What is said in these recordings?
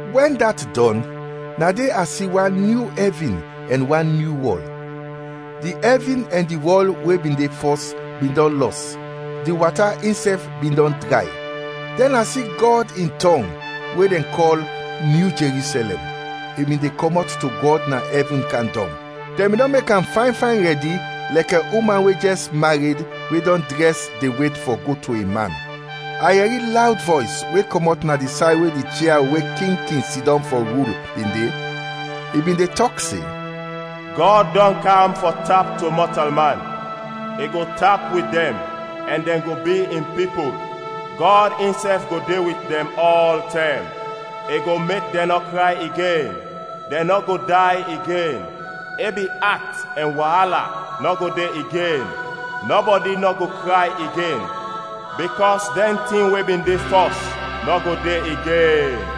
Wɛn dat dɔn, na de a si wan nyu ɛvin ɛn wan nyu wɔl. Di ɛvin ɛn di wɔl we bin de fɔs bin dɔn lɔs, di wata insɛf bin dɔn dray. Dɛn a si Gɔd in tɔng, we dɛn kɔl, nyu Jerusɛlɛm, i bin de kɔmɔt to Gɔd na ɛvin kam dɔng, dɛn bin dɔn mek am fayn fayn rɛdi, lɛkɛ uman we jɛs mared we dɔn drɛs de wet fɔ go to in man. A yɛri lawd vɔys we kɔmɔt na di say we di chia we king kin sidɔm fɔ rul, bin de; i bin de tɔk se, “Gɔd dɔn kam fɔ tap to mɔtalman, i go tap wit dɛn ɛn dɛn go bi in pipul. Gɔd insɛf go de wit dɛn ɔltɛm. I go mek dɛn nɔ kray igen; dɛn nɔ go day igen; ebi at ɛn waala nɔ go de igen; nɔbɔdi nɔ go kray igen, bikɔs dɛn tin we bin de fɔs nɔ go de igen.”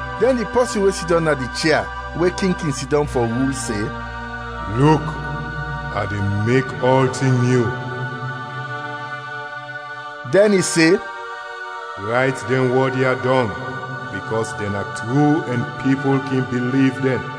Dɛn di pɔsin we sidɔm na di chia we king kin sidɔm fɔ rul, se, “Luk, a de mek ɔltin nyu!” Dɛn i se, “Rayt dɛn wɔd ya dɔng, bikɔs dɛn na tru ɛn pipul kin biliv dɛn.”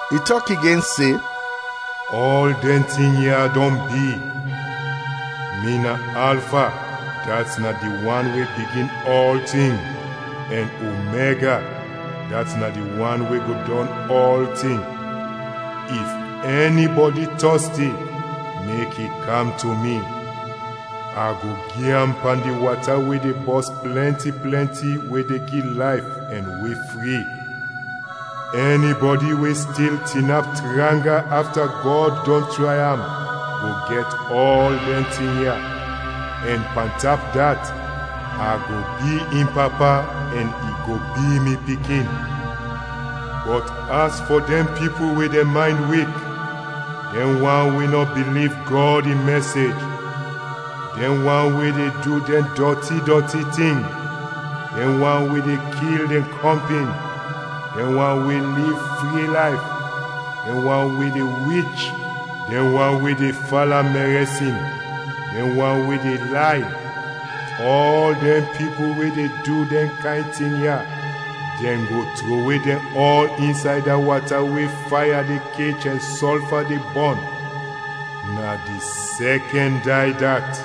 I tɔk igen se, “Ɔl dɛn tin ya dɔn bi. Mi na Alfa, dat na di wan we bigin ɔltin, ɛn Omega, dat na di wan we go dɔn ɔltin. If ɛnibɔdi tɔsti, mek i kam to mi, a go gi am pan di wata we de bɔs plɛnti plɛnti we de gi layf; ɛn we fri. Ɛnibɔdi we stil tinap tranga afta Gɔd dɔn tray am go gɛt ɔl dɛn tin ya, ɛn pantap dat, a go bi in Papa ɛn i go bi mi pikin. Bɔt as fɔ dɛn pipul we dɛn maynd wik, dɛn wan we nɔ biliv Gɔd in mɛsej, dɛn wan we de du dɛn dɔti dɔti tin, dɛn wan we de kil dɛn kɔmpin, dɛn wan we liv fri layf, dɛn wan we de wich, dɛn wan we de fala mɛrɛsin, dɛn wan we de lay, ɔl dɛn pipul we de du dɛn kayn tin ya, dɛn go trowe dɛn ɔl insay da wata we faya de kech ɛn sɔlfa de bɔn. Na di sɛkɛn day dat.”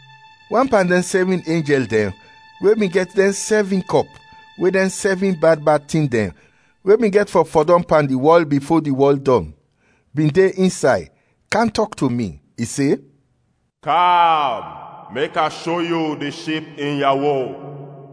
Wan pan dɛn sɛvin enjɛl dɛn we bin gɛt dɛn sɛvin kɔp we dɛn sɛvin bad bad tin dɛn we bin gɛt fɔ fɔdɔm pan di wɔl bifo di wɔl dɔn, bin de insay, kam tɔk to mi, i se, “Kam mek a sho yu di Ship in yawo.”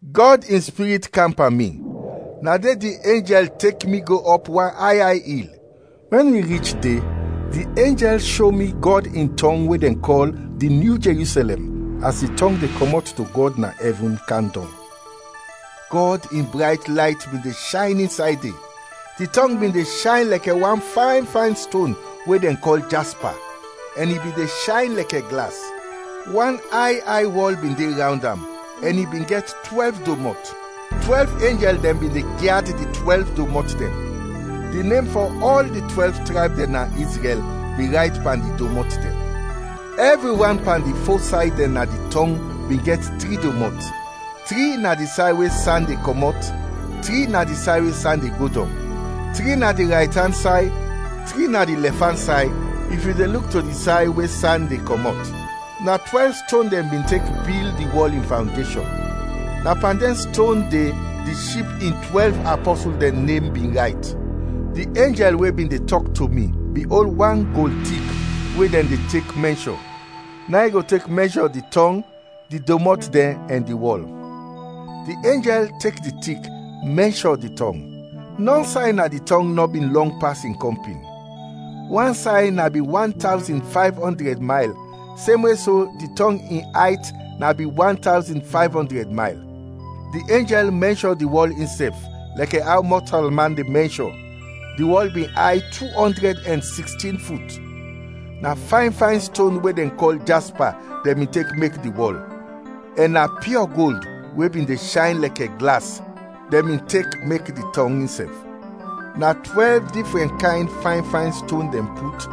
Gɔd in Spirit kam pan mi, na de di enjɛl tek mi go ɔp wan ay ay il. Wɛn wi rich de, di enjɛl sho mi Gɔd in tɔng we dɛn kɔl di nyu Jerusɛlɛm as di tɔng de kɔmɔt to Gɔd na ɛvin kam dɔng. Gɔd in brayt layt bin de shayn insay de; di tɔng bin de shayn lɛkɛ wan fayn fayn ston we dɛn kɔl jaspa, ɛn i bin de shayn lɛkɛ glas. Wan ay ay wɔl bin de rawnd am, ɛn i bin gɛt twɛlv domɔt. Twɛlv enjɛl dɛn bin de gyad di twɛlv domɔt dɛn. Di nem fɔ ɔl di twɛlv trayb dɛn na Izrɛl bin rayt pan di domɔt dɛn. Ɛvri wan pan di fo say dɛn na di tɔng bin gɛt tri domɔt: tri na di say we san de kɔmɔt, tri na di say we san de go dɔng, tri na di raytan say, tri na di lɛfan say if yu de luk to di say we san de kɔmɔt. Na twɛlv ston dɛn bin tek bil di wɔl in fawndeshɔn. Na pan dɛn ston de di Ship in twɛlv apɔsul dɛn nem bin rayt. Di enjɛl we bin de tɔk to mi bin ol wan gold tik we dɛn de tek mɛnshɔ; na in i go tek mɛnshɔ di tɔng, di domɔt dɛn ɛn di wɔl. Di enjɛl tek di tik, mɛnshɔ di tɔng. Nɔn say na di tɔng nɔ bin lɔng pas in kɔmpin. Wan say na bin wan tawzin fayv ɔndrɛd mayl, semwe so di tɔng in ayt na bin wan tawzin fayv ɔndrɛd mayl. Di enjɛl mɛnshɔ di wɔl insɛf, lɛkɛ aw mɔtalman de mɛnshɔ, di wɔl bin ay tu ɔndrɛd ɛn sikstin fut. Na fayn fayn ston we dɛn kɔl jaspa dɛn bin tek mek di wɔl, ɛn na piɔ gold we bin de shayn lɛkɛ glas dɛn bin tek mek di tɔng insɛf. Na twɛlv difrɛn kayn fayn fayn ston dɛn put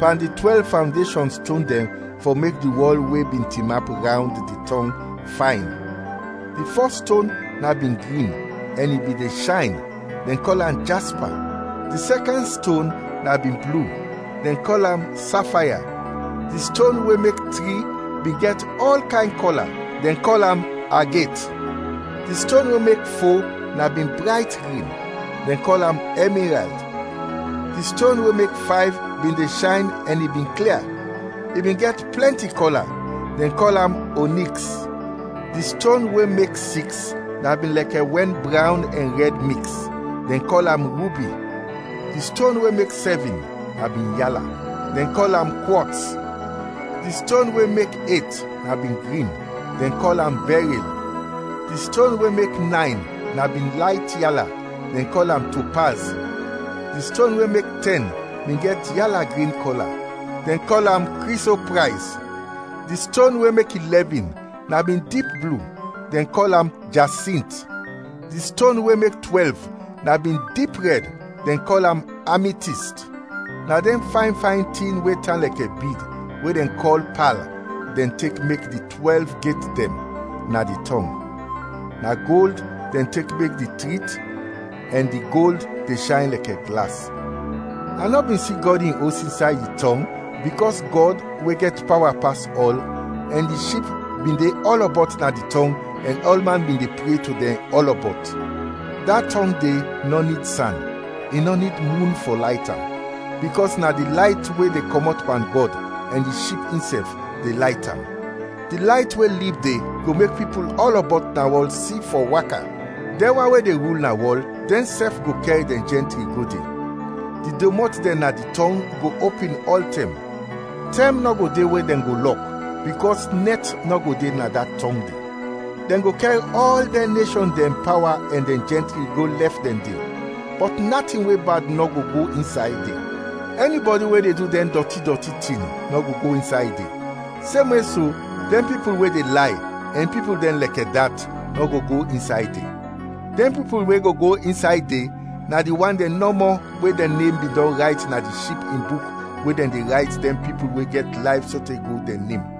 pan di twɛlv fawndeshɔn ston dɛn fɔ mek di wɔl we bin tinap rawnd di tɔng, fayn. Di fɔs ston na bin grin ɛn i bin de shayn, dɛn kɔl am jaspa; di sɛkɛn ston na bin blu, dɛn kɔl am safaya; di ston we mek tri bin gɛt ɔl kayn kɔla, dɛn kɔl am aget; di ston we mek fo na bin brayt grin, dɛn kɔl am ɛmirald; di ston we mek fayv bin de shayn ɛn i bin klia, i bin gɛt plɛnti kɔla, dɛn kɔl am oniks; di ston we mek siks na bin lɛkɛ wɛn brawn ɛn rɛd miks, dɛn kɔl am rubi; di ston we mek sɛvin na bin yala, dɛn kɔl am kwɔts; di ston we mek et na bin grin, dɛn kɔl am bɛril; di ston we mek nayn na bin layt yala, dɛn kɔl am topaz; di ston we mek tɛn bin gɛt yala-grin kɔla, dɛn kɔl am kri so prayz; di ston we mek ilɛvin na bin dip blu, dɛn kɔl am jasint; di ston we mek twɛlv na bin dip rɛd, dɛn kɔl am ami tist. Na dɛn fayn fayn tin we tan lɛkɛ bid we dɛn kɔl pal dɛn tek mek di twɛlv get dɛn na di tɔng, na gold dɛn tek mek di trit, ɛn di gold de shayn lɛkɛ glas. A nɔ bin si Gɔd in Os insay di tɔng bikɔs Gɔd, we gɛt pawa pas ɔl, ɛn di Ship bin de ɔlɔbɔt na di tɔng ɛn ɔlman bin de pre to dɛn ɔlɔbɔt. Da tɔng de nɔ nid san, i nɔ nid mun fɔ layt am, bikɔs na di layt we de kɔmɔt pan Gɔd, ɛn di Ship insɛf, de layt am. Di layt we lib de go mek pipul ɔlɔbɔt na wɔl si fɔ waka. Dɛn wan we de rul na wɔl dɛnsɛf go kɛr dɛn jɛntri go de. Di domɔt dɛn na di tɔng go opin ɔltɛm, tɛm nɔ go de we dɛn go lɔk, bikɔs nɛt nɔ go de na da tɔng de. Dɛn go kɛr ɔl dɛn neshɔn dɛn pawa ɛn dɛn jɛntri go lɛf dɛn de. Bɔt natin we bad nɔ go go insay de, ɛnibɔdi we de du dɛn dɔti dɔti tin nɔ go go insay de, semwe so, dɛn pipul we de lay, ɛn pipul dɛn lɛkɛ dat, nɔ go go insay de. Dɛn pipul we go go insay de, na di wan dɛn nɔmɔ we dɛn nem bin dɔn rayt na di Ship in buk we dɛn de rayt dɛn pipul we gɛt layf sote go dɛn nem.